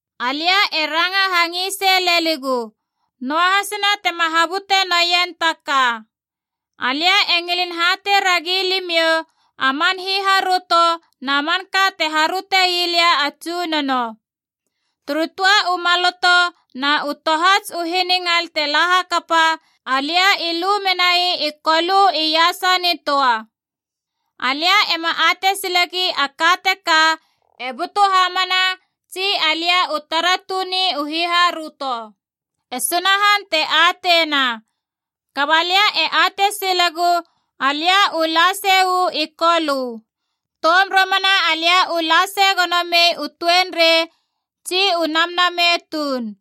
Alia e ranga hangisei leligu, noahasina tema habute noien taka. Alia e ngilin hatei ragi limiou a man hiharöto na manka te haröte ii lia a Tsunono. Turu töa u maloto na u tohats u hiningal te la kapa, alia i lu menai i Kolö iasa nitöa. Alia ema atei silegi a ka teka e butu hamana tsi alia u tara tuni u hiharöto. E Sunahan te ateina. Kaba lia e atei silegu alia u la sei uu i Kolö. Toum romana alia u la sei gono mei u tuenrei tsi u namnamei tuun.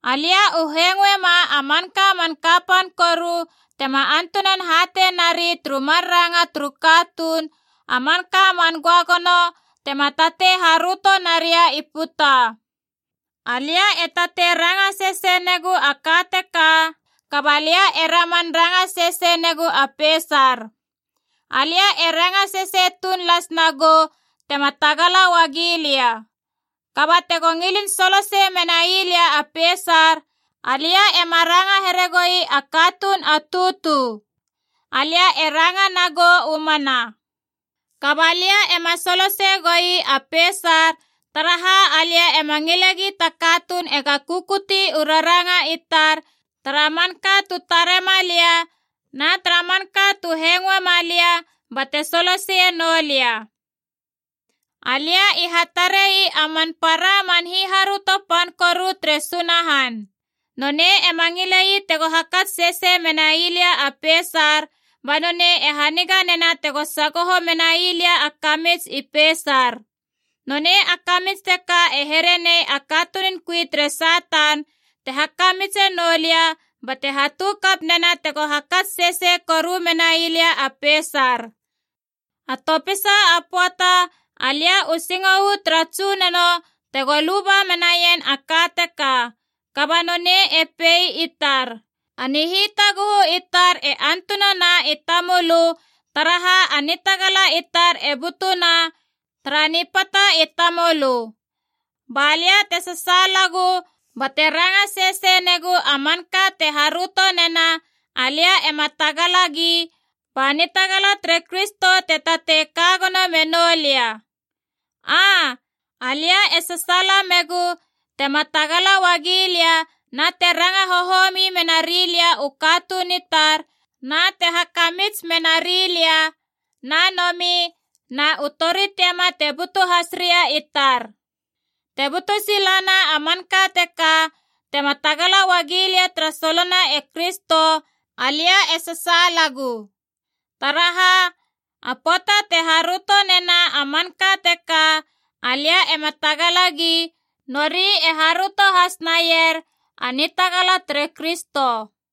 Alia u hengoema a manka man kapan koru tema antunan hatei nari turu mar ranga turu katuun, a manka man göagono tema tatei haröto naria i puta. Alia e tatei ranga sesei negu a ka teka, kaba lia e raman ranga sesei negu a peisar. Alia e ranga sesei tuun las nagou tema tagala uagi lia. Kaba tego ngilin solosei menai lia a peisar, alia ema ranga here goi a katuun a tutu, alia e ranga nagou u mana. Kaba lia ema soloseie goi a peisar, taraha alia ema ngile gi ta katuun ega kukuti u raranga i tar tara manka tu tarema lia na tara manka tu hengoema lia bate soloseie noulia. Alia i hatare ii a man para a man hiharöto pan koru tere Sunahan. Nonei ema ngile ii tego hakats sesei menai lia a peisar, ba nonei e haniga nena tego sagoho menai lia a kamits i peisar. Nonei a kamits teka e here nei a katunun kui tere Satan te hakamitse noulia bate hatu kap nena tego hakats sesei koru menai lia a peisar. A topisa a pöata alia u singo uu tara Tsunono tego luba menaien a ka teka. Kaba nonei e pei i tar, “A nihitaguhu i tar e antunana i tamölö, taraha a nitagala i tar e butuna tara nipata i tamölö.” Balia te sasaalagu bate ranga sesei negu a manka te haröto nena alia ema tagalagi, ba nitagala tere Kristo te tatei kagono menoulia. Aa, alia e sasaala megu tema tagala uagi lia na te ranga hohomi menarilia u katuun i tar, na te hakamits menari lia, na nomi na u tori tiama te butu has ria i tar. Te butu silana a manka teka tema tagala uagilia tara solona e Kristo, alia e sasaalagu. Taraha, a pöata te haröto nena a manka teka alia ema tagalagi, nori e haröto has naier a nitagala tere Kristo.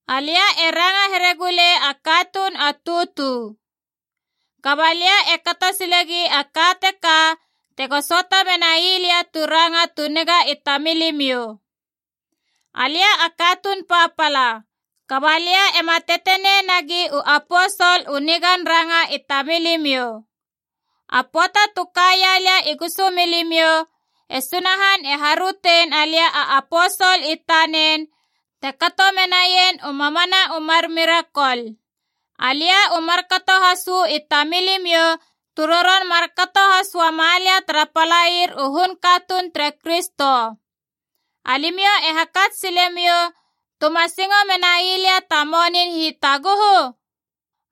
Alia e ranga here gulei a katuun a tutu. Kaba lia e kato silegi a ka teka tego söata menai lia tu ranga tu niga i tamilimiou. Alia a katuun papala, kaba lia ema tetenei nagi u aposol u nigan ranga i tamilimiou. A pöata tu kaia lia i gusumilimiou, e Sunahan e harötein alia a aposol i tanen, te kato menaien u mamana u mar mirakol. Alia u markato has uu i tamilimiou tu roron markato has uamalia tara palair u hun katuun tere Kristo. Alimiou e hakats silemiou tuma singo menai lia ta monin hitaguhu?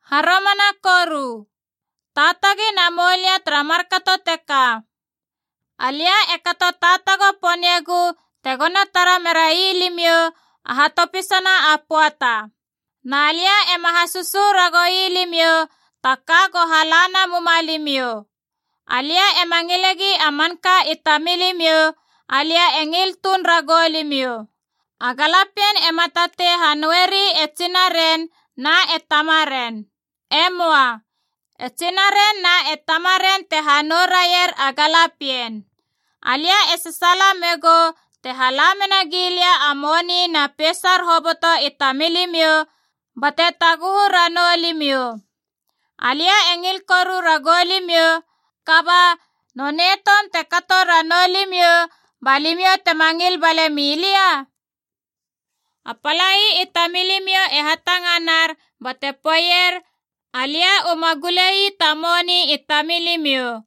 Haromana koru, taatagi namoulia tara markato teka. Alia e kato taatago poniegu tegona tara merai limiou, a hatopisana a pöata. Na lia ema hasösö ragoui limiou ta ka go hala namuma limiou. Alia ema ngilegi a manka i tamilimiou, alia e ngil tuun ragou limiou. A galapien ema tatei hanoueri e tsinaren na e tamaren. E möa. E tsinaren na e tamaren te hanou raier a galapien. Alia e sasaala megou te hala mena gilia u moni na peisar hoboto i tamilimiou bate taguhu ranou limiou. Alia e ngil koru ragou limiou, kaba, nonei toum te kato ranou limiou balimiou tema ngil balemi lia? A palai i tamilimiou e hatanganar bate poeier alia uma gulei ta moni i tamilimiou.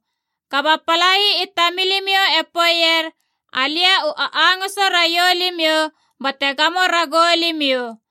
Kaba palai i tamilimiou e poeier alia u angöngoso raiou limiou bate gamo ragou limiou.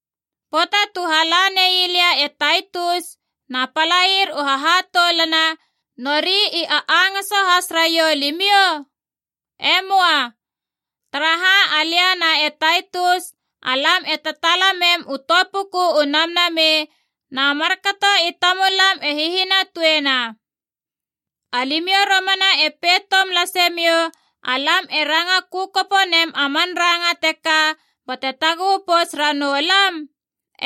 Pöata tu hala ne la lia e Taitus na palair u hahatoulana, nori i a angoso has raiou limiou? E möa. Taraha alia na e Taitus, alam e tataala mem u töa puku u Namnamei na markato i tamulam e hihinatuena. Alimiou romana e pei toum lase miou alam e ranga kökopo nem a man ranga teka bate taguhu pouts ranou lam?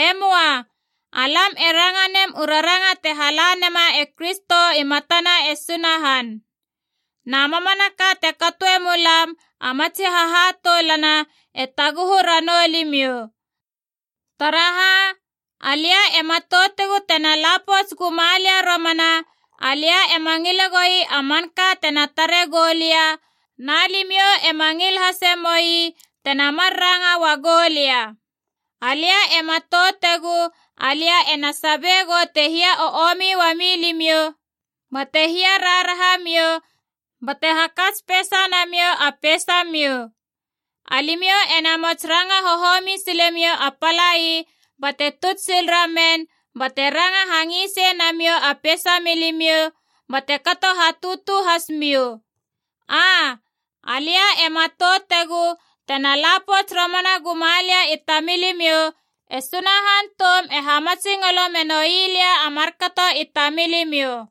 E möa. Alam e ranga nem u raranga te hala nema e Kristo i matana e Sunahan, na mamanaka te katoe mulam a matsi hahatoulana, e taguhu ranou limiou. Taraha, alia e matoutegu tena la pouts guma lia romana, alia ema ngile goi a manka tena tare goulia na limiou ema ngil hase moi tena mar ranga ua goulia. Alia e matoutegu alia e na sabie gou te hia o omi uamiou limiou bate hia raharaha miou bate hakats peisa namiou a peisamiou. Alimiou e namos ranga hohomi silemou a palai bate tuts sil ramen, bate ranga hangisei namiou a peisa milimiou bate kato hatutu has miou. Aa, alia e matoutegu tena la pouts romana guma lia i tamilimiou, e Sunahan toum e hamatsingolo menoi lia a markato i tamilimiou.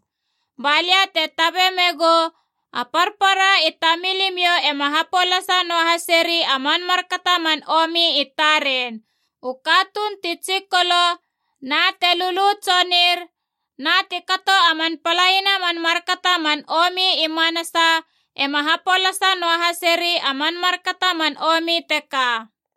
Balia te tabe me gou, a parpara i tamilimiou ema hapolasa noahaseri a man markato a man omi i taren. U katuun ti tsikolo na te lulu tsonir na ti kato a man palaina a man markato a man omi i manasa ema hapolasa noahaseri a man markato a man omi teka.